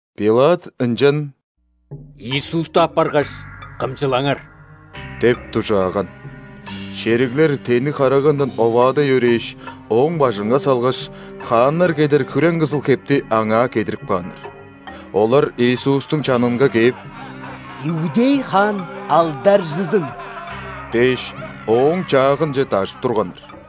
Пилат ынчан: «Иисусту аппаргаш, кымчылаңар!» – деп дужааган. Шериглер тенниг харагандан оваадай өрээш, Ооң бажынга салгаш, хааннар кедер хүрең-кызыл хепти Аңаа кедирип кааннар. Олар Иисустуң чанынга кээп: «Иудей хаан алдаржызын!» – дээш, Ооң чаагынче дажып турганнар.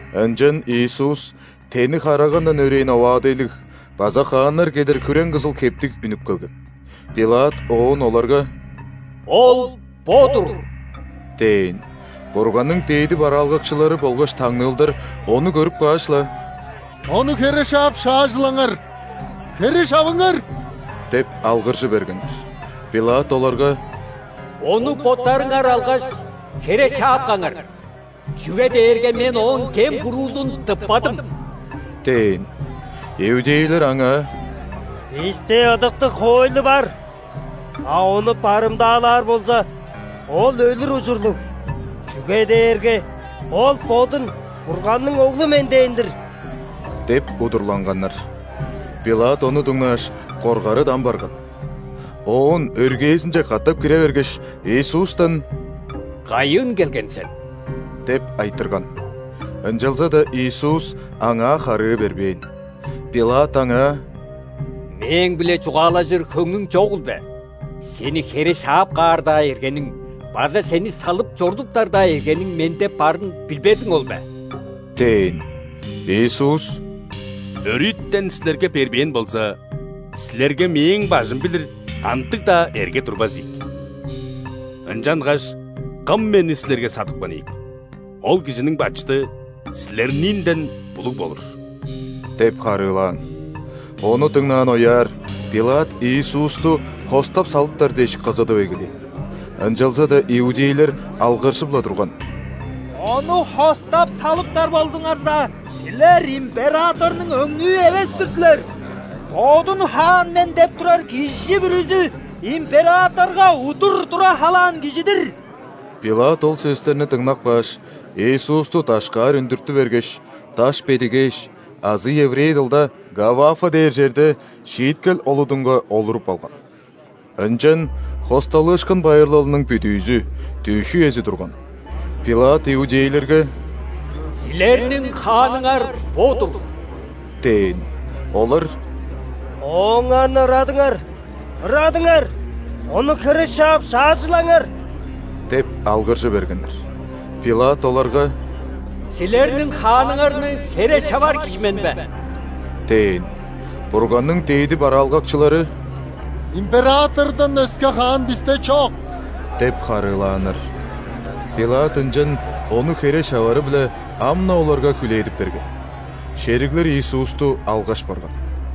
Ынчан Иисус тенниг харагандан өрээн оваадайлыг база хааннар кедер хүрең-кызыл хептиг үнүп келген. Пилат оон оларга: «Ол бо-дур!» – дээн. Бурганның дээди бараалгакчылары болгаш таңныылдар Ону көрүп кааш-ла: «Ону хере шаап шаажылаңар! Хере шавыңар!» – деп алгыржы бергеннер. Пилат оларга: «Ону боттарыңар алгаш, хере шаап каңар, чүге дээрге мен Ооң кем-буруузун тыппадым» – дээн. Иудейлер аңаа: «Бисте ыдыктыг хоойлу бар, а ону барымдаалаар болза, Ол өлүр ужурлуг, чүге дээрге Ол Бодун Бурганның Оглу мен дээн-дир» – деп удурланганнар. Пилат ону дыңнааш, коргары дам барган. Оон өргээзинче катап кире бергеш, Иисустан: «Кайыын келген сен?» – деп айтырган. Ынчалза-даа Иисус аңаа харыы бербээн. Пилат Аңаа: «Мээң-биле чугаалажыр хөңнүң чогул бе? Сени хере шаап каар-даа эргениң база Сени салып чорудуптар-даа эргениң Менде барын билбезиң ол бе?» – дээн. Иисус: «Өрүтен силерге бербээн болза, силерге Мээң бажым билир кандыг-даа эрге турбас ийик. Ынчангаш кым Мени силерге садыпкан ийик, ол кижиниң бачыды силерниинден улуг болур» – деп харыылаан. Ону дыңнаан ояар, Пилат Иисусту хостап салыптар дээш кызыдып эгелээн. Ынчалза-даа иудейлер алгыржып-ла турган: «Ону хостап салыптар болзуңарза, силер императорнуң өңнүү эвес-тир силер. Бодун „Хаан мен“ деп турар кижи бүрүзү – императорга удур тура халаан кижи-дир!» Пилат ол сөстерни дыңнап кааш, Иисусту дашкаар үндүртү бергеш, «Даш бедигээш» азы еврей дылда «Гаввафа» дээр черде шииткел олудунга олуруп алган. Ынчан ·Хосталыышкын байырлалының бүдүүзү, дүъш үези турган. Пилат иудейлерге: «Силерниң хааныңар бо-дур!» – дээн. Олар: «Ооңарны ырадыңар! Ырадыңар! Ону хере шаап шаажылаңар!» – деп алгыржы бергеннер. Пилат оларга: «Силерниң хааныңарны хере шавар кижи мен бе?» – дээн. Бурганның дээди бараалгакчылары: «Императордан өске хаан бисте чок» – деп харыылааннар. Пилат ынчан Ону хере шавары-биле ам-на оларга хүлээдип берген. Шериглер Иисусту алгаш барган.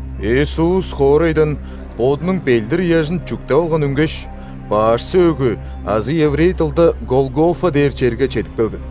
Иисус хоорайдан Бодунуң ·белдир-ыяжын чүктеп алган үнгеш, «Баш сөөгү» азы еврей дылда «Голгофа» дээр черге чедип келген.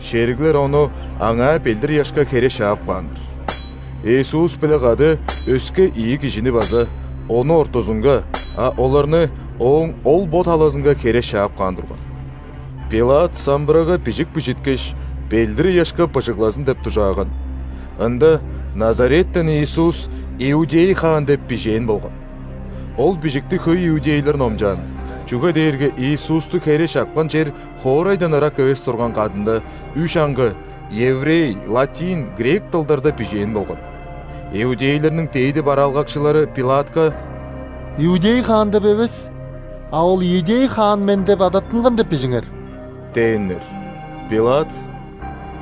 Шериглер Ону аңаа белдир-ыяшка хере шаап кааннар. Иисус-биле кады өске ийи кижини база – Ону ортузунга, а оларны Ооң ол-бо талазынга хере шаап каан турган. Пилат самбырага бижик бижиткеш, белдир-ыяшка быжыглазын деп дужааган. Ында: «Назареттен Иисус – иудей хаан» – деп бижээн болган. Ол бижикти хөй иудейлер номчаан, чүге дээрге Иисусту хере шапкан чер хоорайдан ырак эвес турган кадында, үш аңгы: еврей, латин, грек дылдарда бижээн болган. Иудейлерниң дээди бараалгакчылары Пилатка: «„Иудей хаан“ деп эвес, а „Ол иудей хаан мен деп адаттынган“ деп бижиңер» – дээннер. Пилат: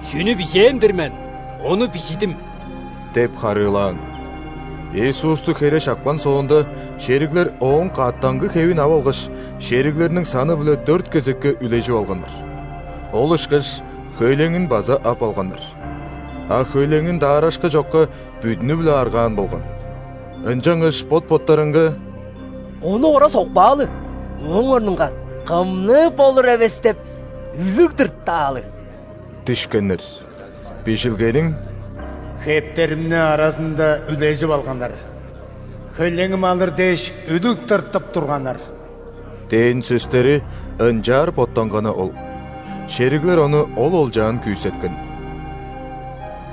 «Чүнү бижээн-дир мен, ону бижидим» – деп харыылаан. Иисусту хере шапкан соонда, шериглер Ооң каъттангы хевин ап алгаш, шериглерниң саны-биле дөрт кезекке үлежип алганнар. Ол ышкаш хөйлеңин база ап алганнар. А хөйлеңин даарашкы чокка, бүдүнү-биле аргаан болган. Ынчангаш бот-боттарынга: «Ону ора сокпаалы, ооң орнунга кымныы болур эвес деп, үлүг тыртаалы» – дишкеннер. (Бижилгениң: «Хептеримни аразында үлежип алганнар, хөйлеңим алыр дээш үлүг тыртып турганнар» дээн сөстери ынчаар боттанганы ол.) Шериглер ону ол олчаан күүсеткен.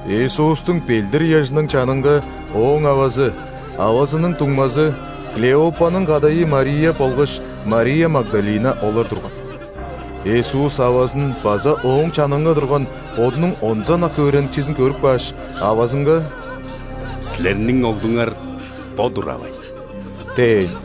Иисустуң белдир-ыяжының чанынга Ооң авазы, авазының дуңмазы, Клеопаның кадайы Мария болгаш Мария Магдалина олар турган. Иисус авазын база ооң чанынга турган Бодунуң онза ынак өөреникчизин көрүп кааш, авазынга: «Силерниң оглуңар бо-дур, авай!» – дээн.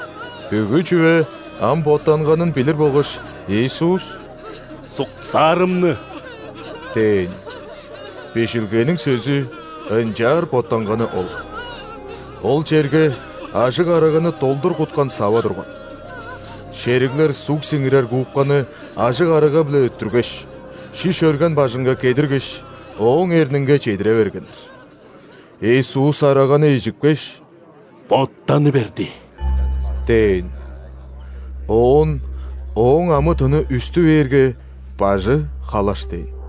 Бүгү чүве ам боттанганын билир болгаш, Иисус: «Суксаарымны!» – дээн. Бижилгениң сөзү ынчаар боттанганы ол. Ол черге ажыг араганы долдур куткан сава турган. Шериглер суг сиңирер губканы ажыг арага-биле өттүргеш, шиш өрген бажынга кедиргеш, Ооң эрнинге чедире бергеннер. Иисус араганы ижипкеш: «Боттаны берди!» – дээн. Оон Ооң амы-тыны үстү бээрге, бажы халаш дээн.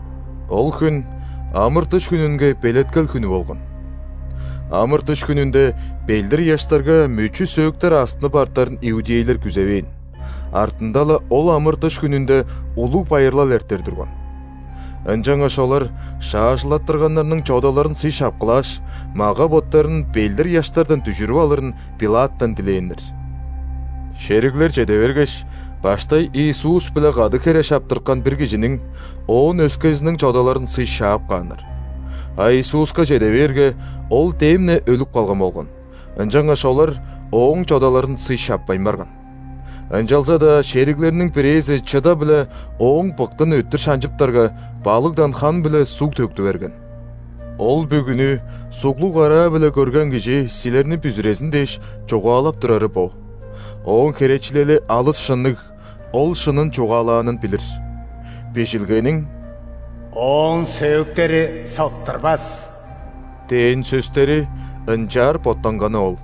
Ол хүн ·амыр-дыш хүнүнге белеткел хүнү болган. Амыр-дыш хүнүнде белдир-ыяштарга мөчү-сөөктер астынып артарын иудейлер күзевээн, артында-ла ол амыр-дыш хүнүнде улуг байырлал эртер турган. Ынчангаш олар шаажылаттырганнарның чодаларын сый шапкылааш, мага-боттарын белдир-ыяштардан дүжүрүп алырын Пилаттан дилээннер. Шериглер чеде бергеш, баштай Иисус-биле кады хере шаптырткан бир кижиниң, оон өскезиниң чодаларын сый шаап кааннар. А Иисуска чеде бээрге, Ол дем-не өлүп калган болган, ынчангаш олар Ооң чодаларын сый шаппайн барган. Ынчалза-даа шериглерниң бирээзи чыда-биле Ооң быктын өттүр шанчыптарга, балыгдан хан биле суг төктү берген. (Ол бүгүнү суглуг караа-биле көрген кижи, силерни бүзүрезин дээш, чугаалап турары бо. Ооң херечилели алыс шынныг, ол шынын чугаалаанын билир.) Бижилгениң: «Ооң сөөктери сыктырбас» дээн сөстери ынчаар боттанганы ол.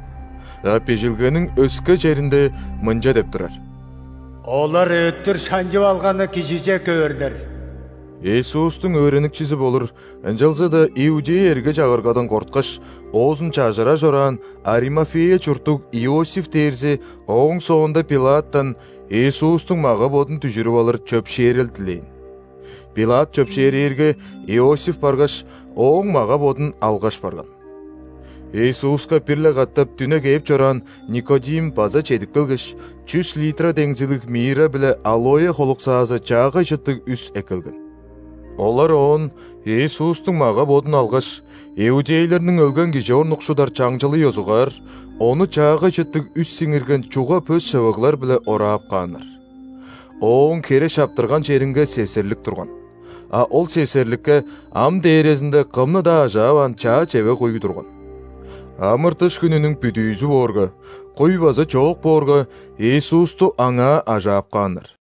А Бижилгениң өске черинде мынча деп турар: «Олар өттүр шанчып алганы Кижиже көөрлер». Иисустуң өөреникчизи болур, ынчалза-даа иудей эрге-чагыргадан корткаш, оозун чажырар чораан Аримафея чурттуг Иосиф дээрзи ооң соонда Пилаттан Иисустуң мага-бодун дүжүрүп алыр чөпшээрел дилээн. Пилат чөпшээрээрге, Иосиф баргаш, Ооң мага-бодун алгаш барган. Иисуска бир-ле катап дүне кээп чораан Никодим база чедип келгеш, чүс литра деңзилиг мирра биле алоэ холуксаазы чаагай чыттыг үс эккелген. Олар оон Иисустуң мага-бодун алгаш, иудейлерниң өлген кижи орнукшудар чаңчылы ёзугаар, Ону чаагай чыттыг үс сиңирген чуга пөс шывыглар-биле ораап кааннар. Ооң хере шаптырган черинге сесерлик турган, а ол сесерликке ам дээрезинде кымны-даа ажааваан чаа чевег-куй турган. Амыр-дыш хүнүнүң бүдүүзү боорга, куй база чоок боорга, Иисусту аңаа ажаап кааннар.